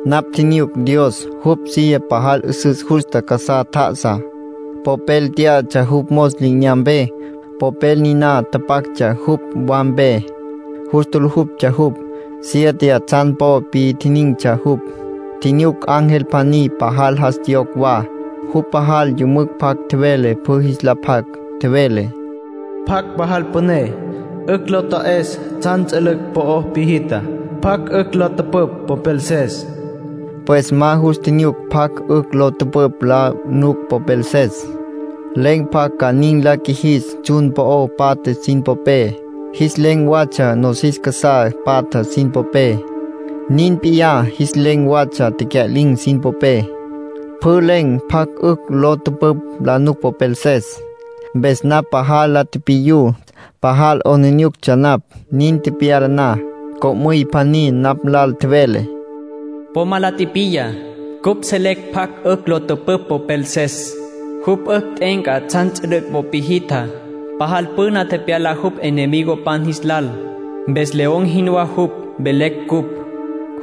Napj tjinyuc Dios, jupj silla pajal 'üsüs justa casá tjá'asa. Popel tyá'atsja jupj mos li'inyampé. Popel niná tapactsja jupj wampé, pje'apé. Jus tjulujuptsja jupj. Siete tsjan po pitjinin̈tsja jupj. Tjinyuc ángel pjaní, pajal jas tjiyocj wa. Jupj pajal yümücj pjac tjevele pjü jis la pjac. Tjevele: “¿Pjacj pajal püné, 'ücj lo ta'es tsjan ts'ülüc' po piji'tja? ¿Pjacj 'ücj la tüpüpj popelses?” Pues ma jus tjinyuc pjacj 'ücj lo tüpüpj la nuc popelses. Len̈ pjacj ca nin la qjuijis tsjun po'o patja sin popé. Jis len̈ watsja nosis casá patja sin popé. Nin p'iyá jis len̈ watsja tecya'lin̈ sin popé. Pjü len̈ pjacj 'ücj lo tüpüpj la nuc popelses. Mpes napj pajal la tipiyú. Pajal 'aplijílatsja napj. Nin tepyala na, co'müy pjaní napj nlal tjevele: “Po ma la tipiya. Cupj selecj pjacj 'ücj lo tüpüpj popelses. Jupj 'ücj t'e'enca tsjan ts'ülüc' po piji'tjá. Pajal püné tepyala jupj enemigopan jis lal, mpes león jinwá jupj, velecj cupj.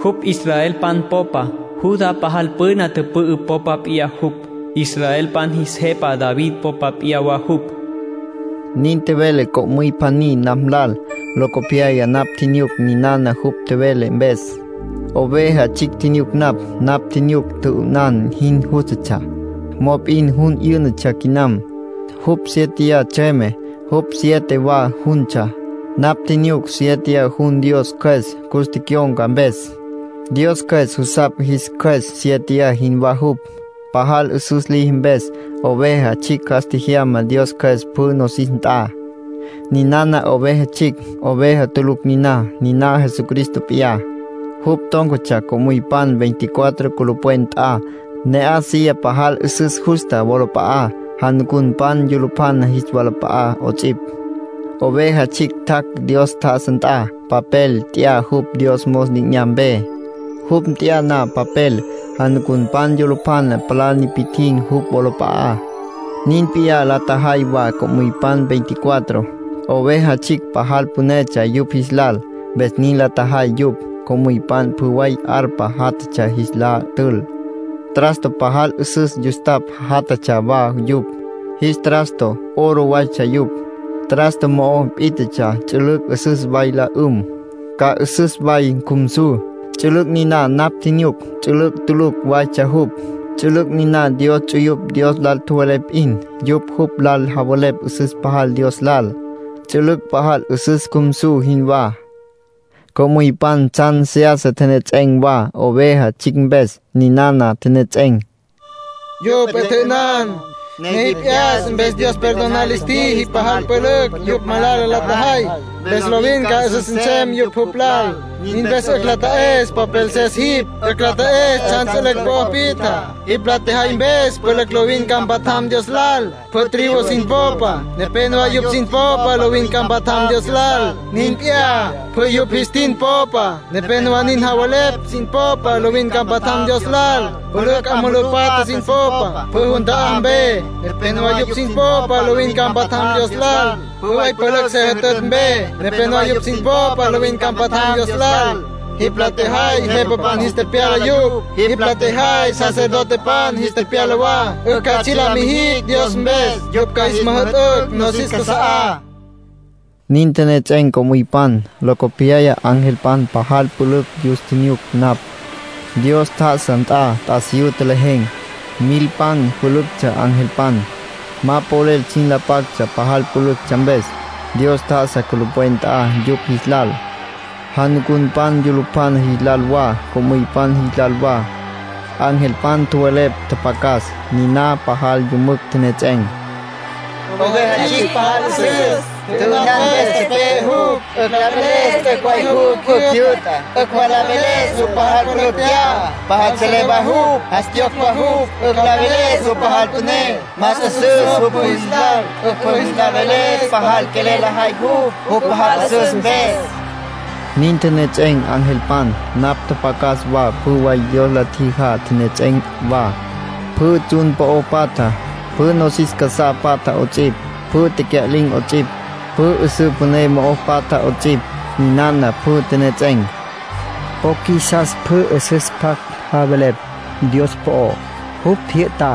Jupj israelpan popa. Judá pajal püna tüpü'ü popa p'iyá jupj. Israelpan jis jepa David popa p'iyá wa jupj.” Nin tjevele co'müy pjaní napj lal. Locopyaya napj tjinyuc ninana jupj tjevele mpes. Oveja Tsjicj tjinyuc napj. Napj tjinyuc tjü'ünan jin jústatsja, mop'in jun 'yǘ'natsja quinam. Jupj siéteya tsjüeme. Jupj siete wa juntsja. Napj tjinyuc siéteya jun Dios Cjües cus tecyon̈ca mpes. Dios Cjües jusapj jis qjues siéteya jinwá jupj, pajal 'üsüs liji mpes. Oveja Tsjicj jas tjejyama Dios Cjües pjü nosis nt'a. Ninana Oveja Tsjicj, oveja tulucj niná. Niná Jesucristo p'iyá. Jupj tón̈catsja co'müypan veinticuatro culupwen nt'a, ne'aj silla pajal 'üsüs justa wolap'a'á, janucunpan yulupjana jis walap'a'á 'ots'ipj. Oveja Tsjicj tjac' Dios tjá'asa nt'a. Papel nt'ya jupj Dios mos li'inyampé. Jupj nt'ya na papel, janucunpan yulupjana palá nipi'tjin̈ jupj wolap'a'á. Nin p'iyá la tjajay wa co'müypan veinticuatro. Oveja Tsjicj pajal pünetsja yupj jis lal, mpes nin la tjajay yupj. Co'müypan pjü way arpa jatjatsja jis la tül. Trasto pajal 'üsüs yustapj jatatsja wa yupj. Jis trasto oro waytsja yupj. Trasto mo'o pít'atsja ts'ülüc' 'üsüs way la 'üm, ca 'üsüs way cjumsu. Ts'ülüc' niná napj tjinyuc ts'ülüc' tulucj waytsja jupj. Ts'ülüc' niná Dios ts'uyupj Dios lal tjowelepj p'in. Yupj jupj lal javelepj 'üsüs pajal Dios lal, ts'ülüc' pajal 'üsüs cjumsu jinwá. Co'müypan tsjan seyasa tjenejets'en̈ wa Oveja Tsjicj mpes. Ninana tjenejets'en̈: “Yupj 'e tjya'ünan, ne jipj 'yas mpes Dios perdonar lis tjiji pajal pülücj yupj malala la tjajay, mpes lovin ca 'üsüs nsem yupj jupj lal. Nin mpes 'ücj la ta'es popelses jipj. 'Ücj la ta'es tsjan ts'ülüc' po piji'tja. Jipj la tjejay mpes pülücj lovin ca mpatjam Dios lal. Pjü tribu sin popa, nepénowa yupj sin popa lovin ca mpatjam Dios lal. Nin p'iyá, pjü yupj jis tin popa, nepénowa nin javelepj sin popa lovin ca mpatjam Dios lal. Pülücj 'a mulú patja sin popa, pjü jun ta'á mpe, nepénowa yupj sin popa lovin ca mpatjam Dios lal. Pjü way pülücj se jütütj mpe, nepénowa yupj sin popa lovin ca mpatjam Dios lal. Jipj la tjejay jepapan jis tepyala yupj. Jipj la tjejay sacerdotepan jis tepyala wa, 'ücj ca tsji' la mijicj Dios mpes. Yupj ca jis müjü'tücj nosis casa'á.” Nin tjenejets'en̈ co'müypan. Locopyaya angelpan pajal pülücj yus tjinyuc napj. Dios tjá'asa nt'a t'asiyú tjelejen̈. Milpan pülüctsja angelpan. Ma polel sin la pactsja pajal pülüctsja mpes. Dios tjá'asa culupwen nt'a yupj jis lal, janucunpan yulupjana jis lal wa, co'müypan jis lal wa. Angelpan tjowelepj tjapjacas. Niná pajal yümücj tjenejets'en̈: “Oveja Tsjicj pajal 'üsüs. Tjü'ünan mpes tepe'e jupj. 'Ücj la veles t'üc' way jupj 'ücj jyü'ta. 'Ücj wa la veles jupj pajal pülücj tya'a, pajal selé wa jupj, jas tjiyocj wa jupj. 'Ücj la veles jupj pajal püné, más 'üsüs jupj pjü jis lal. 'Ücj pjü jis la veles pajal quelel lajay jupj, jupj pajal 'üsüs mpes.” Nin tjenejets'en̈ angelpan. Napj tjapjacas wa pjü way Dios la tjijá tjenejets'en̈ wa, pjü tsjun po'o patja, pjü nosis casá patja 'ots'ipj, pjü tecya'lin̈ 'ots'ipj, pjü 'üsǘ püné mo'o patjá 'ots'ipj. Ninana pjü tjenejets'en̈: “Po qjuisas pjü 'üsüs pjac javelepj Dios po'ó. Jupj jyü'ta.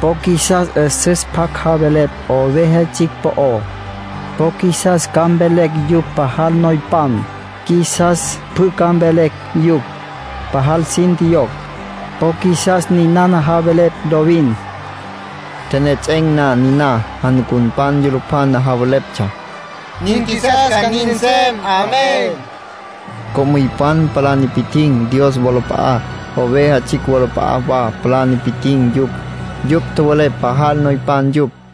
Po qjuisas 'üsüs pjac javelepj Oveja Tsjicj po'ó. Po qjuisas ca mvelecj yupj pajal noypan. Qjuisas pjü ca mvelecj yupj pajal sin tjiyocj. Po qjuisas ninana javelepj lovin.” Tjenejets'en̈ na niná, janucunpan yulupjana javeleptsja: “Nin qjuisas ca nin nsem”. Co'müypan palá nipi'tjin̈ Dios wolap'a'á, Oveja Tsjicj wolap'a'á wa palá nipi'tjin̈ yupj. Yupj tjowelepj pajal noypan yupj.